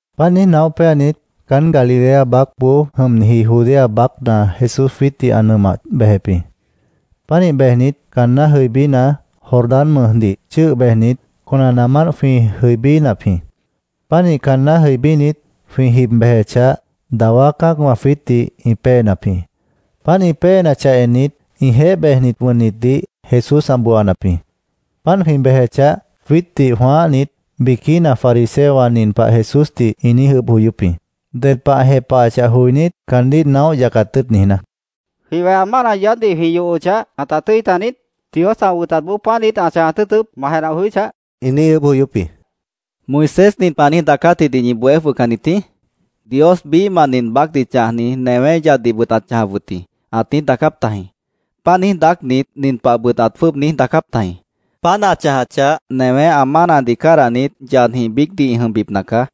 Páant niíj naóh péanit, caán Galilea baácboó jʉmniji Judea baácna Jesús jwiítdih ã nʉmah bejep jĩ. Pánih bejnit, caanná jʉibína, Jordán mʉjdih chʉ́ʉh bejnit, conanaamánt jwĩ jʉibínap jĩ. Pánih caanná jʉibínit, jwĩ jib bejechah, dawá cã́acwã jwiítdih ĩ péenap jĩ. Páant ĩ péenachah ennit, ĩjeéh bejnit wʉnnitdih Jesús ã booanap jĩ. Páant jwĩ bejechah, jwiítdih jwãáhnit, biquína fariseowã nin pah Jesúsdih ĩ niíj ʉʉ́bh joyóp jĩ, ded pah ã jepahachah joinít, caandíh naóh yacat tʉ́ʉt niijná: —¿Jwĩ weha mána yaádhdih jwĩ yohochah, ãta tʉ́i taniít? ¿Dios ã wʉtatboó páant niít ã chãjat tʉ́ʉtʉp, ma jenah joyóchah? ĩ niíj ʉʉ́bh joyóp jĩ. —¿Moisés nin pah ã niíj daacátjidih ñi bohé jwʉhcannit jĩí? ‘Dios biíhmah nin baácdih chãjni newé yaddihbʉt ãt chãjap wʉt jĩ’, ãt niíj daacáp tajĩ. Páant niíj daácnit, nin pahbʉt ãt jwʉ́ʉb niíj daacáp tajĩ: ‘Páant ã chãjachah, newé ã mánadih cádahnit, yadjĩh biícdih ã jʉmbipna caá.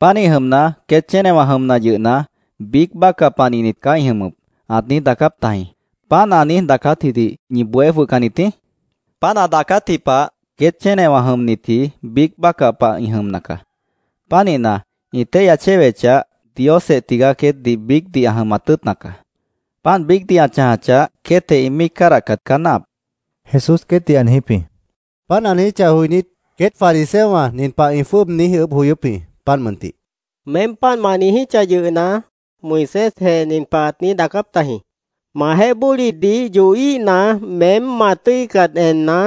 Pánih jʉmna, queét chénewã jʉmna yʉhna, biíc bácah panihnit caá ĩ jʉmʉp’, ãt niíj daacáp tajĩ.¿Páant ã niíj daacátjidih ñi bohé jwʉhcannit jĩí? Páant ã daacátji pah queét chénewã jʉmnitji biíc bácah pah ĩ jʉmna caá. Pánihna, ĩ téihya chéwechah, Diosjeh tigaá queétdih biícdih ã jʉmat tʉ́ʉtna caá. Páant biícdih ã chãjachah, queétjeh ĩ míic cádahcat caá náahap, Jesús queétdih ã niijíp jĩ. Páant ã niijíchah joinít, queét fariseowã nin pah ĩ jwʉ́ʉb niíj ʉʉ́bh joyóp jĩ, páant mʉntih: —Meém páant ma niijíchah yʉhna, Moisésjeh nin pah ãt niíj daacáp tajĩ: ‘Majeéh bólidih yohíhna, “Meém ma tʉ́icat enna,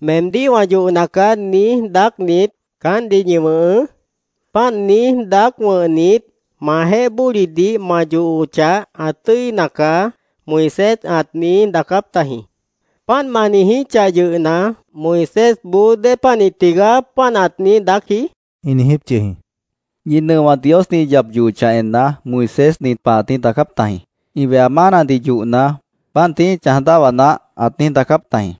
meemdíh wã yohna caá”, niíj daácnit, caántdih ñi wʉ̃hʉʉ́. Páant niíj daác wʉ̃hnit, majeéh bólidih ma yohochah, ã tʉ́ina caá’, Moisés ãt niíj daacáp tajĩ. ¿Páant ma niijíchah yʉhna, Moisésboó dépanih tigaá páant ãt niíj daácji? ĩ niijíp yʉh jĩ. —Ñi nʉowã Diosdih ĩ yap yohochah enna, Moisés nin pah ãt niíj daacáp tajĩ ‘Ĩ weha mánadih yohna, páant tií ĩ chãj dáhwa naáh’, ãt niíj daacáp tajĩ.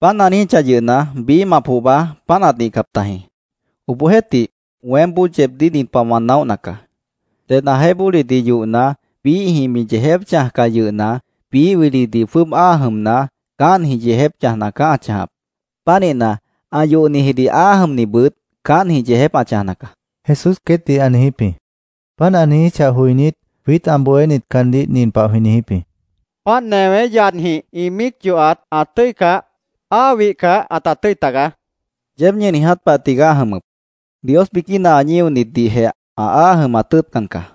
Páant ã niijíchah yʉhna, biíhmah pohba páant ãt nihcap tajĩ. Obohjeéhtih, weémboó yeebdíh nin pah wã naóhna caá: Ded ãjeéh bólidih yohna, biíhjĩh mi yeejép chãjcah yʉhna, biíh wilidih jwʉ́ʉb áa jʉmna, caántjĩh yeejép chãjna caá ã chãjap. Pánihna, ã yohnihjidih áa jʉmnibʉt caántjĩh yeejép ã chãjna caá, Jesús queétdih ã niijíp jĩ. Páant ã niijíchah joinít, jwiít ã bohénit caandíh nin pah jwĩ niijíp jĩ: —Páant newé yadjĩh ĩ míic yohat ã tʉ́icah, áa wihcah ãta tʉ́i tagaá, jwĩ niijíp jĩ. —Yeéb ñi niiját pahjeh tigaá ã jʉmʉp. Dios biquína ã ñíonitdihjeh ã áa jʉmat tʉ́ʉtcan caá.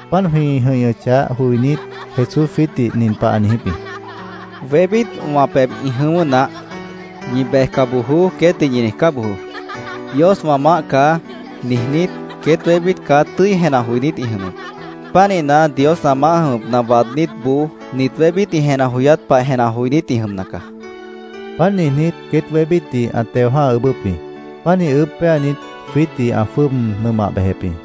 Páant jwĩ jʉ̃ihñʉchah joinít, Jesús jwiítdih nin pah ã niijíp jĩ: —Wébít wã pebh ĩ jʉ̃ʉ́wʉ́ naáh. ‘Ñi bejca bojoó’, queétdih ñi niijcá bojoó. ‘Dios wã maáh caá’, niijnít, queét wébít caá tʉ́i jenah joinít ĩ jʉmʉp. Pánihna, Dios ã maáh jʉmʉpna waadnítboó nit wébít ĩ jenah joyát pah jenah joinít ĩ jʉmna caá, ã niijíp jĩ. Páant niijnít, queét wébítdih ã teo jã́ha ʉʉ́bʉ́p jĩ. Pánih ʉʉ́bh péanit, jwiítdih ã jwʉ́ʉb nʉmah bejep jĩ.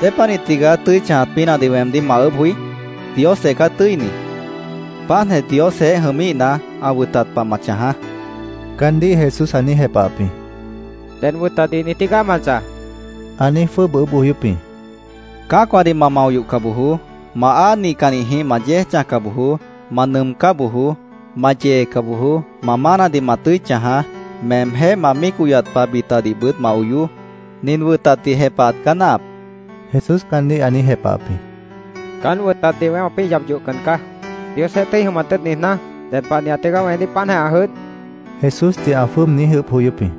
—¿Dépanih tigaá tʉ́i chãjat pínahdih weemdíh ma ʉʉ́bh joí? Diosjeh caá tʉ́ini. Páantjeh Diosjeéh jʉmíhna, ã wʉtat pah ma chãjaá, caandíh Jesús ã niíj jepahap jĩ. —¿Ded wʉtatdih niij tígaá ma chãj? ã niíj jwʉ́ʉb ʉʉ́bh joyóp jĩ. —Cã́acwãdih ma mao yohca bojoó. Ma áa nihcannijĩh ma yéej chãjca bojoó. Ma nʉʉmcá bojoó.Ma yeeca bojoó. Ma mánadih ma tʉ́i chãjaá.Meemjéh ma míic oyat pah bitadihbʉt ma oyoó.Nin wʉtatdih jepahat caá náahap, Jesús caandíh ã niíj jepahap jĩ. —Caán wʉtatdih weém wãpĩ́ yap yohcan caá. ¿Diosjeéh tʉ́i jʉmat tʉ́ʉt niijná, ded panihat tigaá weemdíh páantjeh ã jʉdh? Jesúsdih ã jwʉ́ʉb niíj ʉʉ́bh joyóp jĩ.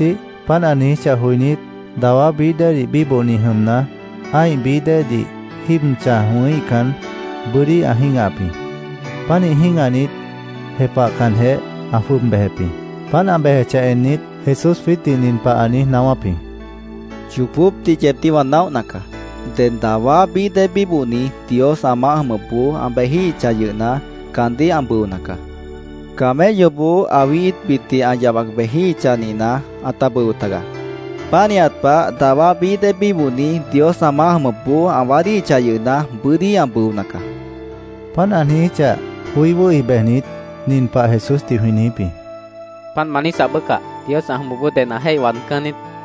Obohjeéhtih, páant ã niijíchah joinít, dawá bií déedih bíbohni jʉmna, ã́ih bií déedih jíib chãj wʉ̃híhcan, bʉ́dí ã jĩ́gahap jĩ. Pánih jĩ́gahnit, jepahcanjeh, ã jwʉ́ʉb bejep jĩ. Páant ã bejechah ennit, Jesús jwiítdih nin pah ã niíj naáwáp jĩ: —Yoobópdih yeebdíh wã naóhna caá. Ded dawá bií déedih bíbohni Dios ã maáh jʉmʉpboó ã bejíhichah yʉhna, caandíh ã bʉona caá. Camelloboó awí íitbitdih ã yabac bejíhichah nihna, ãta bʉo tagaá. Pánihat pah, dawá bií déedih bíbohni Dios ã maáh jʉmʉpboó ã waádíhichah yʉhna, bʉ́dí ã bʉona caá, ã niijíp jĩ. Páant ã niijíchah, joí wʉ́hi bejnit, nin pah Jesúsdih jwĩ niijíp jĩ: —Páant ma niijíchah bácah, Dios ã jʉmʉpboó ded ã jéih waadcán niít, jwĩ niijíp jĩ.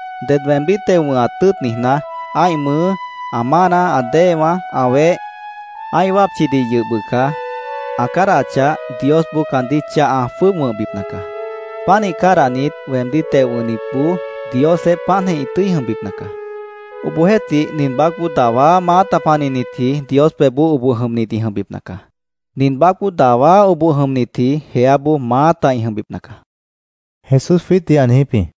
Ded weemdíh teo wʉ̃hat tʉ́ʉt niijná, ã́ih mʉʉ́, ã mána, ã déewã, ã weh, ã́ih wápchidih yʉh bʉca ã cádahachah, Diosboó caandíh chah ã jwʉ́ʉb wʉ̃hbipna caá. Pánih cádahnit, weemdíh teo wʉ̃hnitboó Diosjeéh páantjeh ĩ tʉ́i jʉmbipna caá. Obohjeéhtih, nin baácboó dawá maáta panihnitji Dios pebhboó oboh jʉmnit ĩ jʉmbipna caá. Nin baácboó dawá oboh jʉmnitji jeáboó maáta ĩ jʉmbipna caá, Jesús jwiítdih ã niijíp jĩ.